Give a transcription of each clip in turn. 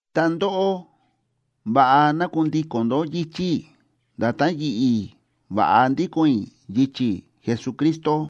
Ta ndóꞌó, va̱ꞌa ná kundíko̱n ndó yichi̱ i̱, nda̱tán yi̱ꞌi̱ va̱ꞌa ndíko̱n i̱ yichi̱ Jesucristo.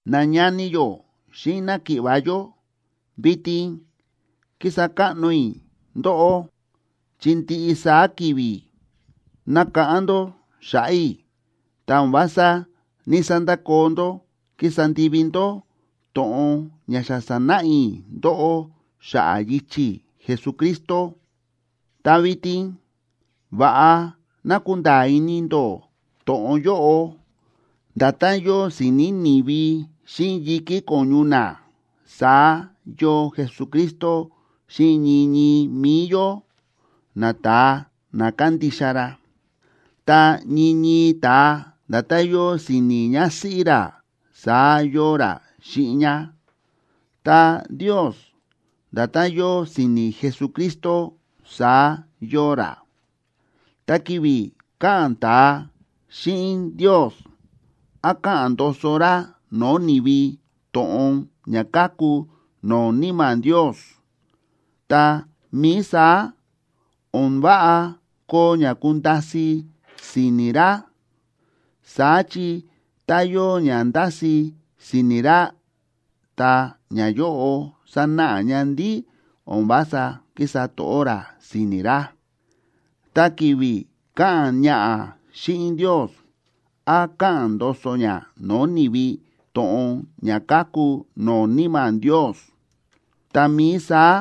Nañani yó xíꞌin náki̱ꞌva̱ yó, vitin kísa káꞌno i̱ ndóꞌó, chi ndiꞌi saá ki̱vi̱ nákáꞌán ndó xa̱ꞌa̱ i̱, ta o̱n vása ní‑sandakoo ndó kísa ndivi ndó to̱ꞌon ña xa sa̱náꞌa i̱ ndóꞌó xa̱ꞌa̱ yichi̱ Jesucristo. Ta vitin va̱ꞌa ná kunda̱a̱ ini ndó to̱ꞌon yóꞌo: Nda̱tán yóo si̱ni̱ ni̱vi xíꞌin yi̱kí ko̱ñu na, saá yóo Jesucristo xíꞌin ñii ñii mi̱i yó, nata̱a na kándixa ra. Ta ñii ñii ta̱a, nda̱tán yóo si̱ni̱ ñásíꞌí ra, saá yóo ra xíꞌin ñá. Ta Ndios, nda̱tán yóo si̱ni̱ Jesucristo saá yóo ra. Ta ki̱vi̱ káꞌa̱n ta̱a xíꞌin Ndios, án káꞌa̱n ndoso ra no̱o̱ ni̱vi to̱ꞌon ña káku no̱o̱ Níma̱ Ndios, tá mií saá, o̱n váꞌa koo ña kunda̱si̱ si̱ni̱ ra. Saá chi tá yóo ña ndási si̱ni̱ ra, ta ñayóꞌo sánáꞌa ña ndí o̱n vása kísa to̱ꞌó ra si̱ni̱ ra. Ta ki̱vi̱ káꞌa̱n ñaꞌa̱ xíꞌin Ndios, án káꞌa̱n ndoso ñá no̱o̱ ni̱vi to̱ꞌon ña káku no̱o̱ Níma̱ Ndios, tá mií saá,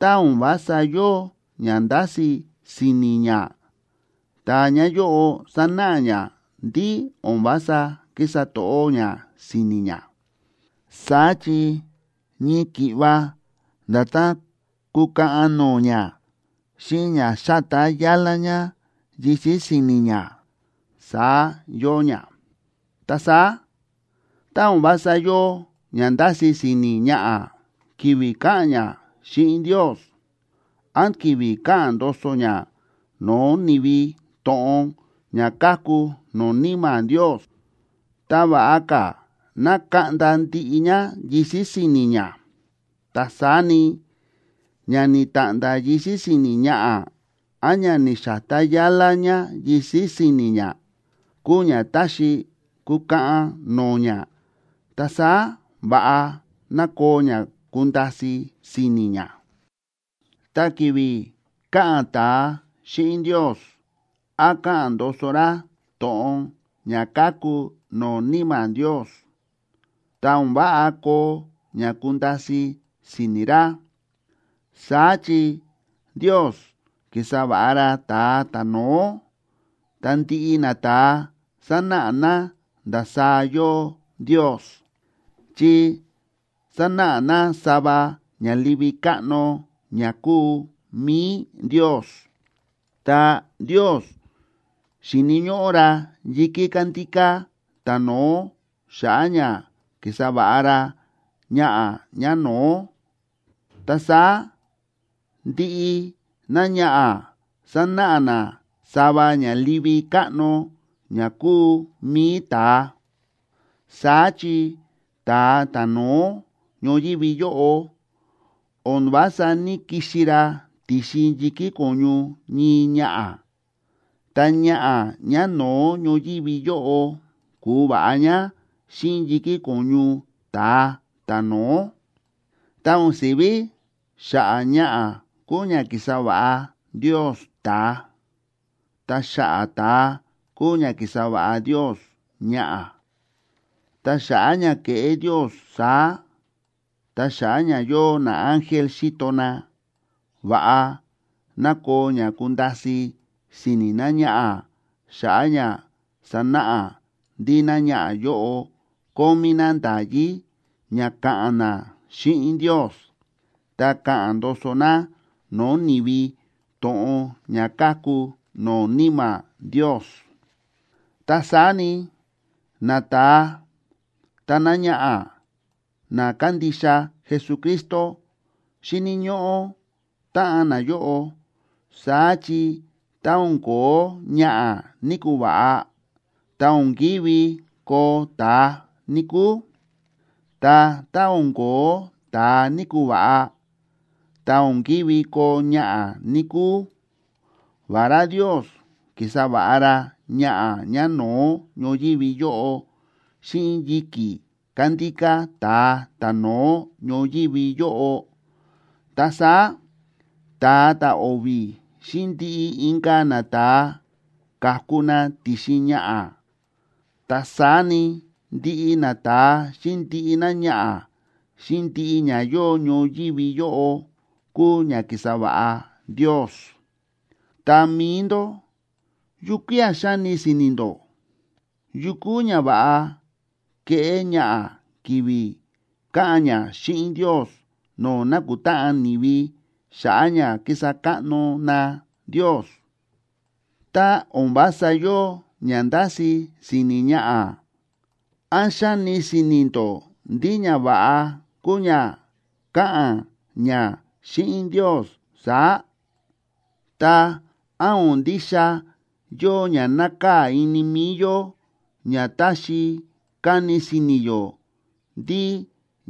tá o̱n vása yóo ña ndási si̱ni̱ ñá, ta ñayóꞌo sánáꞌa ña ndí o̱n vása kísa to̱ꞌó ñá si̱ni̱ ñá. Saá chi ñii ki̱ꞌva nda̱tán kúkaꞌan no̱o̱ ñá xíꞌin ña xátá yálá ñá yisi̱ si̱ni̱ ñá, saá yóo ña. Ta saá, tá o̱n vása yóo ña ndási si̱ni̱ ñaꞌa̱ ki̱vi̱ káꞌa̱n ñá xíꞌin Ndios, án ki̱vi̱ káꞌa̱n ndoso ñá no̱o̱ ni̱vi to̱ꞌon ña káku no̱o̱ Níma̱ Ndios, ta, ¡va̱ꞌa ka̱ ná kaꞌnda ndiꞌi ñá yisi̱ si̱ni̱ ñá! Ta saá ni, ña ni̱ta̱ꞌnda̱ yisi̱ si̱ni̱ ñaꞌa̱, án ña ni̱xa̱tá yálá ñá yisi̱ si̱ni̱ ñá, kúu ña táxi kukaꞌan no̱o̱ ñá. Ta saá va̱ꞌa ná koo ña kunda̱si̱ si̱ni̱ ñá. Ta ki̱vi̱ káꞌa̱n ta̱a xíꞌin Ndios, án káꞌa̱n ndoso ra to̱ꞌon ña káku no̱o̱ Níma̱ Ndios, ta o̱n váꞌa koo ña kunda̱si̱ si̱ni̱ ra. Saá chi, Ndios ki̱sa va̱ꞌa ra ta̱a ta̱no̱ó, ta ndiꞌi nata̱a sánáꞌa na ndasaá yóo Ndios, chi sánáꞌa na sava ña livi káꞌno ña kúu mi̱i Ndios. Ta Ndios xi̱ni̱ ñóꞌó ra yi̱kí kándíká ta̱no̱ó xa̱ꞌa̱ ña ki̱sa va̱ꞌa ra ñaꞌa̱ ñáno̱ó. Ta saá ndiꞌi náñaꞌa̱ sánáꞌa ná sava ña livi káꞌno ña kúu mi̱i ta̱a. Saá chi ta̱a ta̱no̱ó ñoyívi yóꞌo o̱n vása ní‑kixi ra ti̱xin yi̱kí ko̱ñu ñii ñaꞌa̱. Ta ñaꞌa̱ ñáno̱ó ñoyívi yóꞌo ku̱va̱ꞌa ñá xíꞌin yi̱kí ko̱ñu ta̱a ta̱no̱ó. Ta o̱n si̱ví xa̱ꞌa̱ ñaꞌa̱ kúu ña ki̱sa va̱ꞌa Ndios ta̱a, ta xa̱ꞌa̱ ta̱a kúu ña ki̱sa va̱ꞌa Ndios ñaꞌa̱. Ta xa̱ꞌa̱ ña ke̱ꞌé Ndios saá, ta xa̱ꞌa̱ ña yóo naángel xíto na, va̱ꞌa ná koo ña kunda̱si̱ si̱ni̱ náñaꞌa̱ xa̱ꞌa̱ ña sanáꞌa ndí náñaꞌa̱ yóꞌo kómí ná nda̱yí ña ka̱ꞌa̱n ná xíꞌin Ndios ta ka̱ꞌa̱n ndoso ná no̱o̱ ni̱vi to̱ꞌon ña káku no̱o̱ Níma̱ Ndios. Ta saá ni, nata̱a ta náñaꞌa̱, na kándixa Jesucristo, xíni̱ ñóꞌó táꞌan nayóꞌo. Saá chi tá o̱n ko̱ó ñaꞌa̱ ní‑kuva̱ꞌa, ta̱ o̱n kívi koo ta̱a, níkúu. Ta tá o̱n ko̱ó ta̱a ní‑kuva̱ꞌa, ta o̱n kívi koo ñaꞌa̱, níkúu. Vará Ndios ki̱sa va̱ꞌa ra ñaꞌa̱ ñáno̱ó ñoyívi yóꞌo xíꞌin yi̱kí kándíká ta̱a ta̱no̱ó ñoyívi yóꞌo, ta saá ta̱a ta̱o̱vi̱ xíꞌin ndiꞌi inka̱ nata̱a ka̱ku na ti̱xin ñaꞌa̱. Ta saá ni, ndiꞌi nata̱a xíꞌin ndiꞌi náñaꞌa̱ xíꞌin ndiꞌi ña yóo ñoyívi yóꞌo kúu ña ki̱sa va̱ꞌa Ndios. Ta mi̱i ndó, ¿yukía̱ xáni si̱ni̱ ndó? ¿Yu kuu ñava̱ꞌa keꞌé ñaꞌa̱ ki̱vi̱ káꞌa̱n ñá xíꞌin Ndios no̱o̱ nákutáꞌan ni̱vi xa̱ꞌa̱ ña kísa káꞌno na Ndios? Tá o̱n vása yóo ña ndási si̱ni̱ ñaꞌa̱, ¿án xáni si̱ni̱ ndó ndí ñava̱ꞌa kuu ña káꞌa̱n ñá xíꞌin Ndios saá? Ta, ¿án o̱n ndixa yóo ña nákaa̱ ini mi̱i yó ña táxi kani si̱ni̱ yó ndí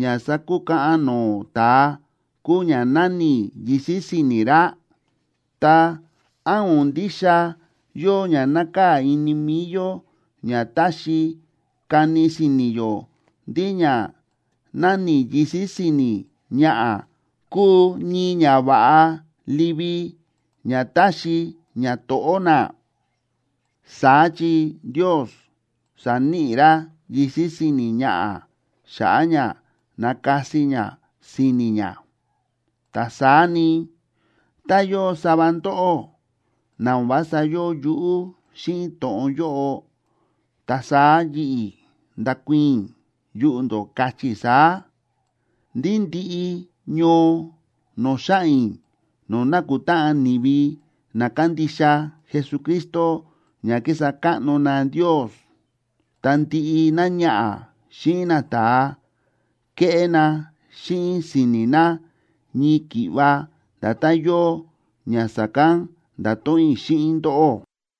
ña sákukaꞌan no̱o̱ ta̱a kúu ña náni̱ ní yisi̱ si̱ni̱ ra? Ta, ¿án o̱n ndixa yóo ña nákaa̱ ini mi̱i yó ña táxi kani si̱ni̱ yó ndí ña náni̱ yisi̱ si̱ni̱ ñaꞌa̱ kúu ñii ñava̱ꞌa livi ña táxi ñato̱ꞌó ná? Saá chi Ndios sa̱níꞌi ra yisi̱ si̱ni̱ ñaꞌa̱ xa̱ꞌa̱ ña nakasi ña si̱ni̱ ñá. Ta saá ni, tá yóo sava ndóꞌó na o̱n vása yóo yuꞌú xíꞌin to̱ꞌon yóꞌo, ta saá yi̱ꞌi̱ ndákuii̱n i̱ yuꞌu̱ ndó, káchí i̱ saá, ndí ndiꞌi ñoo no̱o̱ xáꞌa̱n i̱, no̱o̱ nákutáꞌan ni̱vi na kándixa Jesucristo ña kísa káꞌno na Ndios, ta ndiꞌi náñaꞌa̱ xíꞌin nata̱a, kéꞌé na xíꞌin si̱ni̱ na ñii ki̱ꞌva nda̱tán yóo ña sa̱kán nda̱to̱ꞌon i̱ xíꞌin ndóꞌó.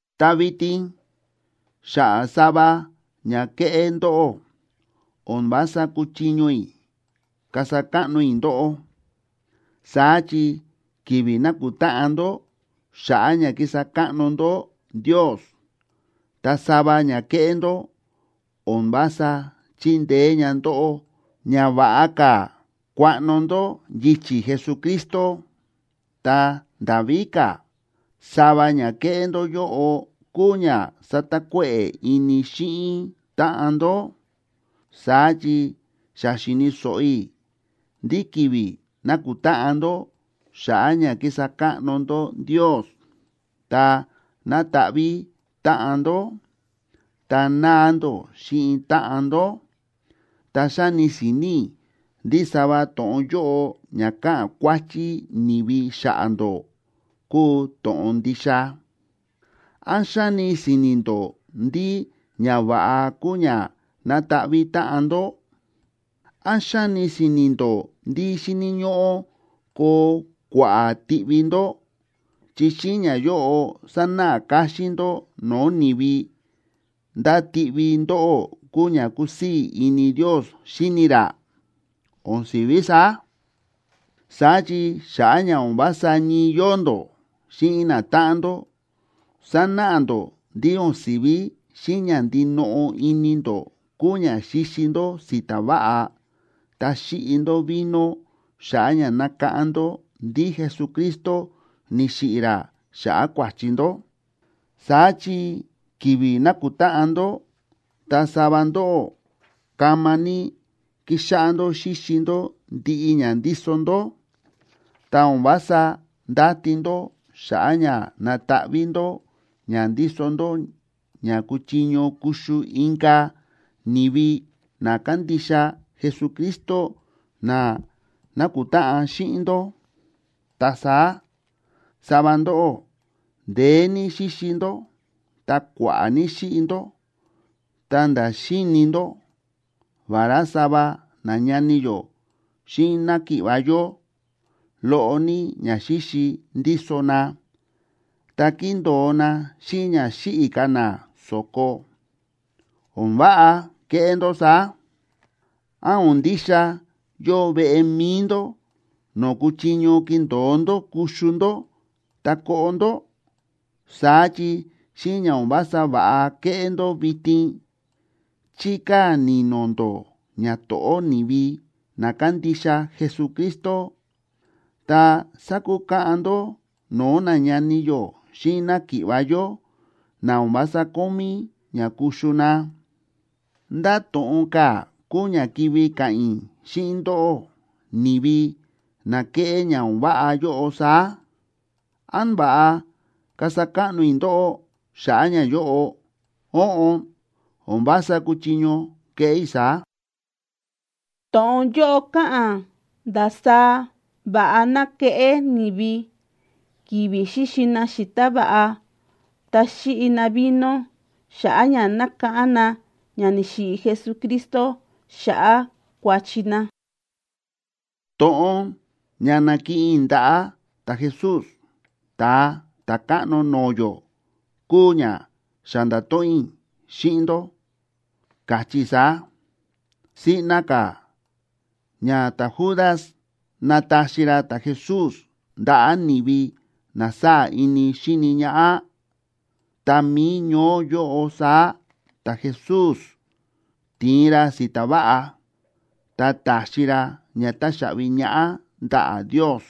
Ta vitin xa̱ꞌa̱ sava ña kéꞌé ndóꞌó, o̱n vása kúchiño i̱ kasa káꞌno i̱ ndóꞌó. Saá chi ki̱vi̱ nákutáꞌan ndó xa̱ꞌa̱ ña kísa káꞌno ndó Ndios, ta sava ña kéꞌé ndó o̱n vása chíndeé ña ndóꞌó ña va̱ꞌa ka̱ kuaꞌno ndó yichi̱ Jesucristo. Ta nda̱ víka̱, sava ña kéꞌé ndó yóꞌo kúu ña sátakuéꞌe̱ ini xíꞌin táꞌan ndó. Saá chi xa xi̱ni̱ so̱ꞌo i̱ ndí ki̱vi̱ nákutáꞌan ndó xa̱ꞌa̱ ña kísa káꞌno ndó Ndios, ta nátaꞌví táꞌan ndó, ta náa ndó xíꞌin táꞌan ndó. Ta xáni si̱ni̱ i̱ ndí sava to̱ꞌon yóꞌo ña káꞌa̱n kuáchí ni̱vi xa̱ꞌa̱ ndó kúu to̱ꞌon ndixa. ¿Án xáni si̱ni̱ ndó ndí ñava̱ꞌa kúu ña na̱taꞌví táꞌan ndó? ¿Án xáni si̱ni̱ ndó ndí xíni̱ ñóꞌó koo kua̱ꞌa̱ tiꞌvi ndó, chi xíꞌin ñayóꞌo sanáꞌa káxín ndó no̱o̱ ni̱vi ndá tiꞌvi ndóꞌó kúu ña kúsii̱ ini Ndios xíni ra? ¡O̱n si̱ví saá! Saá chi xa̱ꞌa̱ ña o̱n vása ñii yóo ndó xíꞌin natáꞌan ndó, sánáꞌa ndó ndí o̱n si̱ví xíꞌin ña ndinoꞌo ini ndó kúu ña xíxi ndó si̱ta̱ váꞌa ta xíꞌi ndó vino xa̱ꞌa̱ ña nákáꞌán ndó ndí Jesucristo ni̱xiꞌi̱ ra xa̱ꞌa̱ kua̱chi ndó. Saá chi ki̱vi̱ nákutáꞌan ndó, ta sava ndóꞌó kama ní kíxáꞌá ndó xíxi ndó ndiꞌi ña ndíso ndó, ta o̱n vása ndáti ndó xa̱ꞌa̱ ña nataꞌví ndó ña ndíso ndó ña kuchiño kuxu inka̱ ni̱vi na kándixa Jesucristo na nákutáꞌan xíꞌin ndó. Ta saá, sava ndóꞌó ndeé ní xíxi ndó ta kua̱ꞌa̱ ní xíꞌi ndó ta̱nda̱ xíini ndó, vará sava nañani yó xíꞌin náki̱ꞌva̱ yó, loꞌo ní ñaxíxi ndíso na, ta kíndo̱o na xíꞌin ña xíꞌi̱ ka̱ na so̱ko. ¡O̱n váꞌa kéꞌé ndó saá! ¿Án o̱n ndixa yóo veꞌe mi̱i ndó no̱o̱ kúchiño kindo̱o ndó kuxu ndó ta koꞌo ndó? Saá chi xíꞌin ña o̱n vása va̱ꞌa kéꞌé ndó vitin, chíkaa̱ ni̱no̱ ndó ñato̱ꞌó ni̱vi na kándixa Jesucristo, ta sákukaꞌan ndó no̱o̱ nañani yó xíꞌin náki̱ꞌva̱ yó na o̱n vása kómí ña kuxu na. ¿Ndá to̱ꞌon ka̱ kúu ña kivi ka̱ꞌa̱n i̱ xíꞌin ndóꞌó, ni̱vi na kéꞌé ña o̱n váꞌa yóꞌo saá? ¿Án va̱ꞌa kasa káꞌno i̱ ndóꞌó xa̱ꞌa̱ ñayóꞌo? Óꞌon, o̱n vása kúchiño keꞌé i̱ saá. To̱ꞌon yóꞌo káꞌa̱n ndasaá va̱ꞌa ná keꞌé ni̱vi ki̱vi̱ xíxi na si̱ta̱ váꞌa ta xíꞌi na vino xa̱ꞌa̱ ña nákáꞌán na ña ni̱xiꞌi̱ Jesucristo xa̱ꞌa̱ kua̱chi na To̱ꞌon ña na̱kiꞌin i̱ ndaꞌa̱ ta̱Jesús, Ta̱a Ta̱káꞌno no̱o̱ yó, kúu ña xa nda̱to̱ꞌon i̱ xíꞌin ndó, káchí i̱ saá: Siꞌna ka̱ ña ta̱Judas na̱taxi ra ta̱Jesús ndaꞌa̱ ni̱vi na sáa̱ ini xíni ñaꞌá, ta mi̱i ñoó yóꞌo saá ta̱Jesús ti̱in ra si̱ta̱ váꞌa, ta ta̱xi ra ña táxaꞌvi ñaꞌá ndaꞌa̱ Ndios,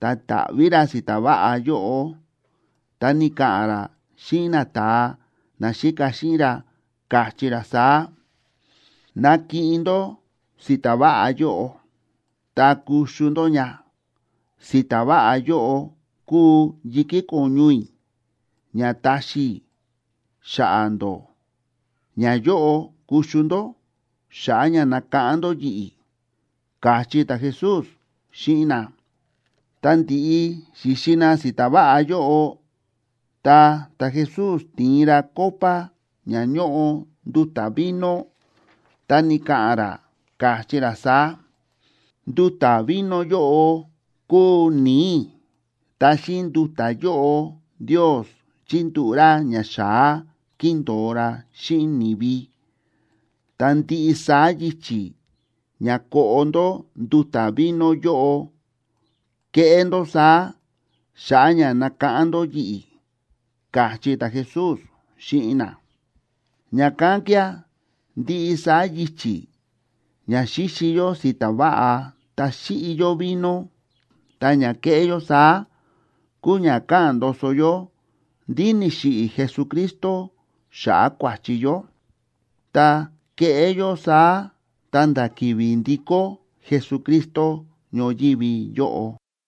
ta ta̱ꞌví ra si̱ta̱ váꞌa yóꞌo, ta ni̱ka̱ꞌa̱n ra xíꞌin nata̱a naxíka xíꞌin ra, káchí ra saá: “Nakiꞌin ndó si̱ta̱ váꞌa yóꞌo, ta kuxu ndó ña. Si̱ta̱ váꞌa yóꞌo kúu yi̱kí ko̱ñu i̱ ña taxi i̱ xa̱ꞌa̱ ndó. Ñayóꞌo kuxu ndó xa̱ꞌa̱ ña nakáꞌán ndó yi̱ꞌi̱”, káchí ta̱Jesús xíꞌin na. Tá ndi̱ꞌi xi̱xi na si̱ta̱ váꞌa yóꞌo, ta ta̱Jesús ti̱in ra copa ña ñóꞌo nduta̱ vino, ta ni̱ka̱ꞌa̱n ra, káchí ra saá: “Nduta̱ vino yóꞌo kúu ni̱i̱ i̱, ta xíꞌin nduta̱ yóꞌo Ndios chíndúꞌu̱ ra ñaxa̱á kíndo̱o ra xíꞌin ni̱vi. Ta ndiꞌi saá yichi̱ ña koꞌo ndó nduta̱ vino yóꞌo, keꞌé ndó saá xa̱ꞌa̱ ña nakáꞌán ndó yi̱ꞌi̱”, káchí ta̱Jesús xíꞌin na. Ña̱kán kía̱ ndiꞌi saá yichi̱ ña xíxi yó si̱ta̱ váꞌa ta xíꞌi yó vino, ta ña kéꞌé yó saá kúu ña káꞌa̱n ndoso yó ndí ni̱xiꞌi̱ Jesucristo xa̱ꞌa̱ kua̱chi yó. Ta keꞌé yó saá ta̱nda̱ ki̱vi̱ ndikó Jesucristo ñoyívi yóꞌo.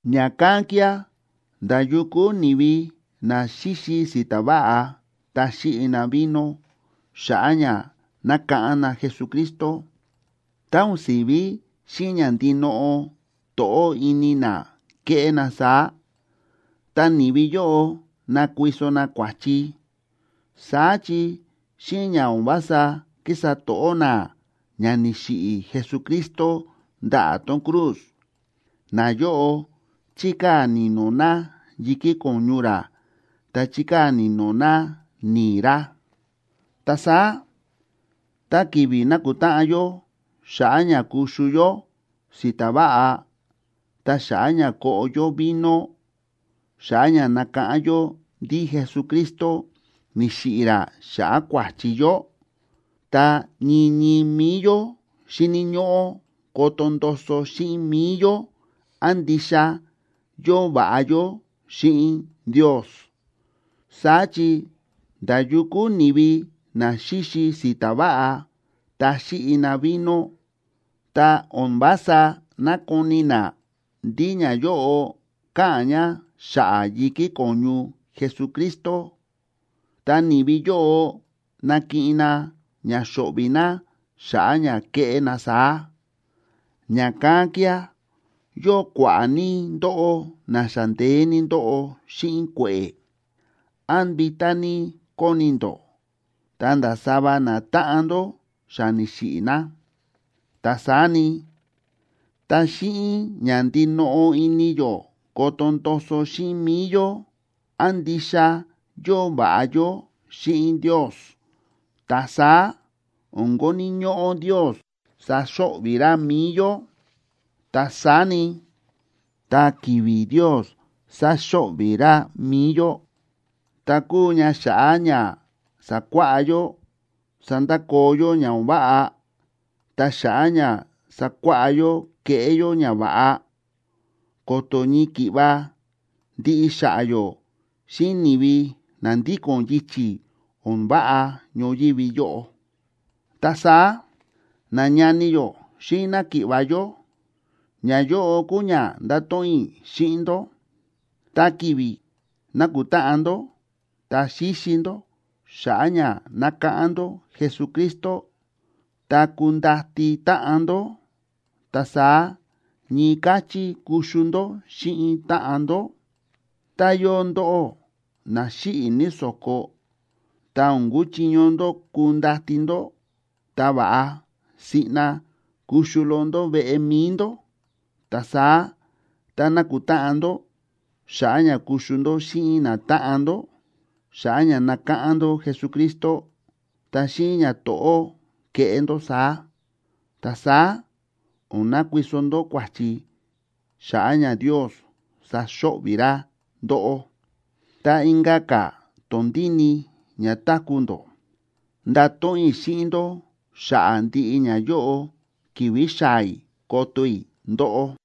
Ña̱kán kía̱ nda̱ yu kúu ni̱vi na xíxi si̱ta̱ váꞌa ta xíꞌi na vino xa̱ꞌa̱ ña nákáꞌán na Jesucristo, tá o̱n si̱ví xíꞌin ña ndinoꞌo to̱ꞌó ini na kéꞌé na saá, ta ni̱vi yóꞌo nákuiso na kua̱chi. Saá chi xíꞌin ña o̱n vása kísa to̱ꞌó na ña ni̱xiꞌi̱ Jesucristo ndaꞌa̱ tón cruz, nayóꞌo chíkaa̱ ni̱no̱ na yi̱kí ko̱ñu ra ta chíkaa̱ ni̱no̱ na ni̱i̱ ra. Ta saá tá ki̱vi̱ nákutáꞌan yó xa̱ꞌa̱ ña kuxu yó si̱ta̱ váꞌa ta xa̱ꞌa̱ ña koꞌo yó vino xa̱ꞌa̱ ña nákáꞌán yó ndí Jesucristo ni̱xiꞌi̱ ra xa̱ꞌa̱ kua̱chi yó, ta ñii ñii mi̱i yó xíni̱ ñóꞌó koto ndoso xíꞌin mi̱i yó án ndixa yóo va̱ꞌa yó xíꞌin Ndios. Saá chi nda̱ yu kúu ni̱vi na xíxi si̱ta̱ váꞌa ta xíꞌi na vino, tá o̱n vása nákoni na ndí ñayóꞌo káꞌa̱n ña xa̱ꞌa̱ yi̱kí ko̱ñu Jesucristo, ta ni̱vi yóꞌo nakiꞌin na ña xo̱ꞌvi̱ na xa̱ꞌa̱ ña kéꞌé na saá. Ña̱kán kía̱ yóo kua̱ꞌa̱ ní ndóꞌó na xa ndeé ní ndóꞌo xíꞌin kue̱ꞌe̱, án vitá ní kóni ndó, ta̱nda̱ sava natáꞌan ndó xa ni̱xiꞌi̱ na. Ta saá ni, tá xíꞌin ña ndinoꞌo ini yó koto ndoso xíꞌin mi̱i yó án ndixa yóo va̱ꞌa yó xíꞌin Ndios, ta saá o̱n koni̱ ñóꞌó Ndios saxo̱ꞌvi̱ ra mi̱i yó. Ta saá ni, tá ki̱vi̱ Ndios sáxo̱ꞌvi̱ ra mi̱i yó, ta kúu ña xa̱ꞌa̱ ña sakuáꞌá yó sandakoo yó ña o̱n váꞌa ta xa̱ꞌa̱ ña sakuáꞌá yó keꞌé yó ñava̱ꞌa, ko̱to̱ ñii ki̱ꞌva ndiꞌi xa̱ꞌa̱ yó xíꞌin ni̱vi na ndíko̱n yichi̱ o̱n váꞌa ñoyívi yóꞌo. Ta saá, nañani yó xíꞌin náki̱ꞌva̱ yó, ñayóꞌo kúu ña ndáto̱ꞌon i̱ xíꞌin ndó: Tá ki̱vi̱ nákutáꞌan ndó ta xíxi ndó xa̱ꞌa̱ ña nákáꞌán ndó Jesucristo, ta kundati táꞌan ndó, ta saá ñii káchí kuxu ndó xíꞌin táꞌan ndó. Tá yóo ndóꞌó na xíꞌi̱ ní so̱ko, ta o̱n kúchiño ndó kundati ndó, ta va̱ꞌa siꞌna kuxu loꞌo ndó veꞌe mi̱i ndó. Ta saá tá nákutáꞌan ndó xa̱ꞌa̱ ña kuxu ndó xíꞌin natáꞌan ndó xa̱ꞌa̱ ña nákáꞌán ndó Jesucristo, ta xíꞌin ñato̱ꞌó keꞌé ndó saá. Ta saá o̱n nakuiso ndó kua̱chi xa̱ꞌa̱ ña Ndios saxo̱ꞌvi̱ ra ndóꞌó. Ta inka̱ ka̱ tondíni ña táku̱ ndó, ndato̱ꞌon i̱ xíꞌin ndó xa̱ꞌa̱ ndiꞌi ñayóꞌo ki̱vi̱ xaa̱ i̱ koto i̱ ndóꞌó.